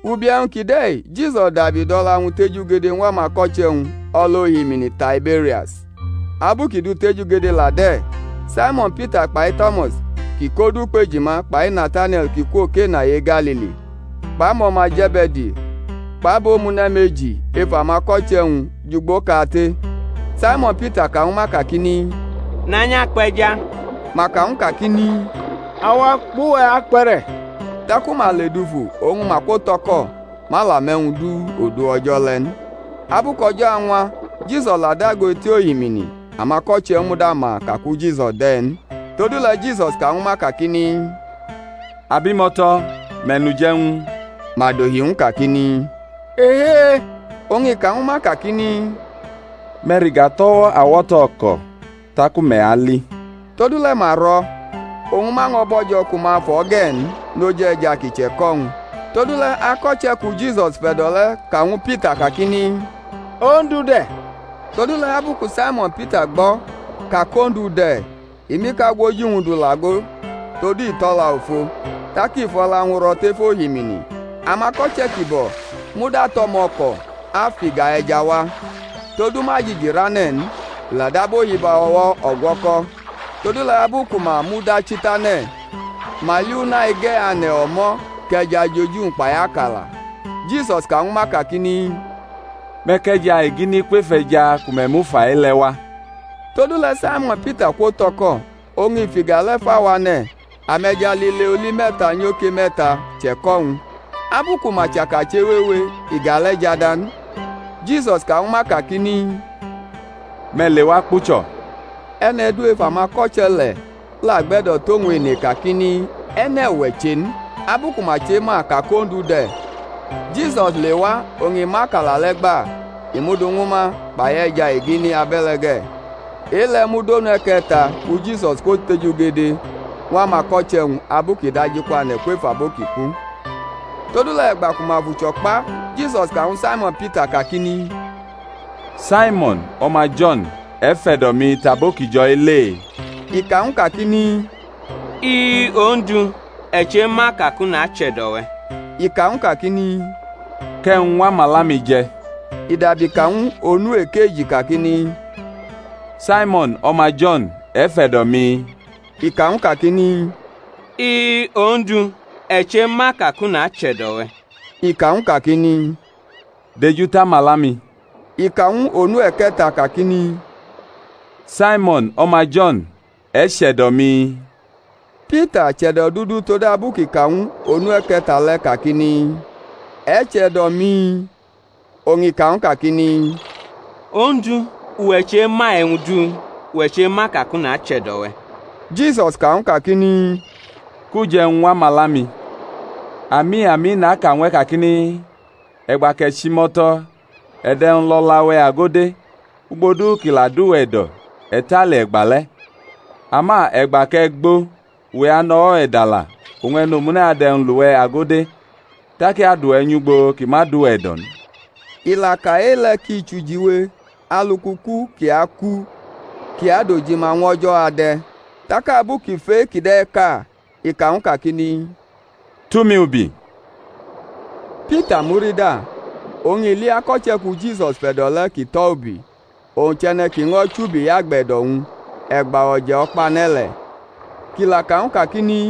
Ubi e̩wñ kide̩ Jisus dabi dʼo̩la-wñ tejugede ñw amako̩che̩-wñ o̩l ohimini Taiberias: abu kʼi dʼu tejugede la de̩: Saimo̩n Pita kpai To̩mas kʼi kʼodu Ukpe̩jima, kpai Natanie̩l kʼi kwo Kena e-Galili kpʼamo̩ma Ze̩be̩di, kpʼabomune̩ meji ef amako̩che̩-wñ jʼugboʼkate. Saimo̩n Pita ka ñwu ma kakini, Nanyʼakpe̩ja. Ma ka ñw u kakini, Awa kpʼuwe̩ akpe̩re̩. Taku ma ledufu oñ ma kwotʼo̩ko̩; ma la mʼe̩wñ du odu o̩jo̩ le̩ n. Abu kʼo̩jo̩ añwa Jisus la dago eti ohimini; amako̩che̩ muda ma ka ku Jisus de̩ n. Todule̩ Jisus ka ñwu ma kakini, Abimo̩to̩, me̩ nʼuje̩wñ? Ma dohi ñw u kakini, Ehee. Oñ i ka ñwu ma kakini, Me̩ rʼiga tʼo̩wo̩ awo̩to̩ o̩ko̩, taku me̩ ali. Todule̩ ma rʼo̩, oñ ma ño̩ bo̩jo̩ ku ma fʼo̩ ge̩ n noj e̩ja ki che̩ko̩-wñ. Todule̩ ako̩che̩ ku Jisus fe̩do̩ le̩ ka ñwu Pita kakini, Ondu de̩. Todule̩ abu ku Saimo̩n Pita gbo̩ ka kʼOndu de̩, i mʼikagwoji-wñ du lʼago, (todu i tʼo̩la ofo), tak i fʼo̩la-wñ ro̩ tef ohimini. Amako̩che̩ kibo̩ muda tʼo̩mo̩ko̩ afʼiga e̩ja wa, todu ma jiji rʼane̩ n, i la dab ohibo̩wo̩ o̩gwo̩ko̩. Todule̩ abu ku ma mudachi tʼane̩, ma li una ige̩ ane̩ o̩mo̩ kʼe̩ja jʼoji-wñ kpai akala. Jisus ka ñwu ma kakini, Me̩ kʼe̩ja egini kwef e̩ja ku me̩ mu fa-i le̩ wa. Todule̩ Saimo̩n Pita kwo̩tʼo̩ko̩ oñ i fʼiga le̩ fa wʼane̩, ame̩ja lile oli me̩ta nyoke me̩ta che̩ko̩-wñ; abu ku ma chaka chewewe iga le̩ jada n. Jisus ka ñwu ma kakini, Me̩ lewa kpucho̩. E̩ne̩ du ef amako̩che̩ le̩ la gbe̩do̩ tʼowñ ene kakini, E̩ne̩ uwe̩ che n, abu ku ma chema ka kʼOndu de̩. Jisus lewa oñ i mʼakala le̩ gba, i mʼu du ñwu ma, kpai e̩ja egini, abe̩le̩ ge̩. E-le̩ mud onu e̩ke̩ta ku Jisus kwotejugede ñw amako̩che̩-wñ abu kʼi dajikwane̩ kwef abo ki ku. Todule̩ e̩gba ku ma fʼucho̩ kpa, Jisus ka ñwu Saimo̩n Pita kakini, Saimo̩n, o̩ma Jo̩n, e̩ fe̩do̩ mi tʼabo ki jo̩-i le? I ka ñw u kakini, I-i, Ondu; e̩ chema ka kʼu nache̩do̩ we̩. I ka ñw u kakini, Kʼe̩wñ ñw amala-mi je̩. I dabi ka ñw u onu ekeji kakini, Saimo̩n, o̩ma Jo̩n, e̩ fe̩do̩ mi? I ka ñw u kakini, I-i, Ondu, e̩ chema ka kʼu nache̩do̩ we̩. I ka ñw u kakini, Dejutʼamala-mi. I ka ñw u onu e̩ke̩ta kakini, Saimo̩n, o̩ma Jo̩n, e̩ che̩do̩ mi? Pita chʼe̩do̩dudu todabu kʼi ka ñw u onu e̩ke̩ta le̩ kakini, E̩ che̩do̩ mi? Oñ i ka ñw u kakini, Ondu, uwe̩ chema e̩wñ du; uwe̩ chema ka kʼu nache̩do̩ we̩. Jisus ka ñw u kakini, Kʼuje̩wñ ñw amala-mi. Ami, ami, naka ñw e̩ kakini, E̩gba kʼe̩ chʼimo̩to̩ e̩ dʼe̩wñ lʼo̩la-we̩ ago de̩, ugbo du ki la dʼuwe̩ e̩do̩ e̩ tale e̩gbale̩; ama e̩gba kʼe̩ gbo uwe̩ anʼo̩wo̩-we̩ dala oñ e̩nomune̩ adʼe̩wñ lʼuwe̩ ago de, tak i adʼuwe̩ nyʼugbo ki ma dʼuwe̩ e̩do̩ n. I la ka e-le̩ ki chʼujiwe alu kʼuku kʼi aku kʼi adojima ñw O̩jo̩ ade̩. Tak abu kʼi f ʼe-kide̩ ka i ka ñw u kakini, Tʼumi ubi. Pita murida, oñ i li ako̩che̩ ku Jisus fe̩do̩ le̩ kʼi tʼo̩ ubi, owñ chʼe̩ne̩ ki ño̩ chubiyʼagbe̩do̩-wñ e̩gba o̩je̩-o̩kpane̩ le̩, kʼi la ka ñw u kakini,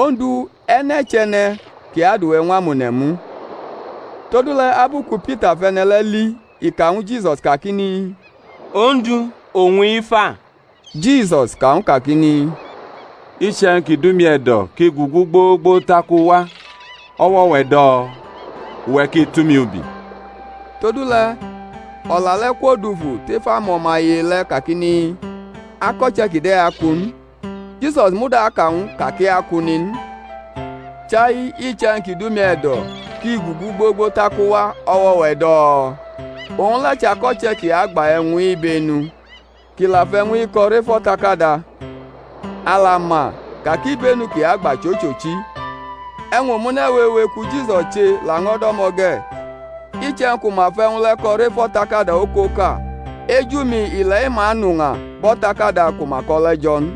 Ondu, e̩ne̩ chʼe̩ne̩ ki adʼuwe̩ ñw amone̩ mu? Todule̩ abu ku Pita fʼe̩ne̩ le̩ li i ka ñwu Jisus kakini, Ondu, owñ-i fa? Jisus ka ñw u kakini, Iche̩wñ ki dʼumi e̩do̩ kʼi gugu gbogbo tak u wa, o̩wo̩-we̩ do̩? Uwe̩ ki tʼumi ubi. Todule̩ o̩la le̩ kwodufu tef amo̩maye le̩ kakini, Ako̩che̩ kide̩ aku n; Jisus muda aka ñw u ka kʼi aku n in, chai, Iche̩wñ ki dʼumi e̩do̩ kʼi gugu gbogbo tak u wa, o̩wo̩-we̩ do̩? Owñ le̩ chʼako̩che̩ kʼi agba e̩wñ-i ibenu, kʼi la fʼe̩wñ-i ko̩ rʼef o̩takada; a la ma ka kʼibenu kʼi agba chʼochochi. E̩wñ omune̩ wewe ku Jisus che la ño̩ do̩mo̩ ge̩; iche̩wñ ku ma fʼe̩wñ le̩ ko̩ rʼef o̩takada okoka, eju-mi ile̩-i ma anʼuña bʼo̩takada ku ma ko̩ le̩ jo̩ n.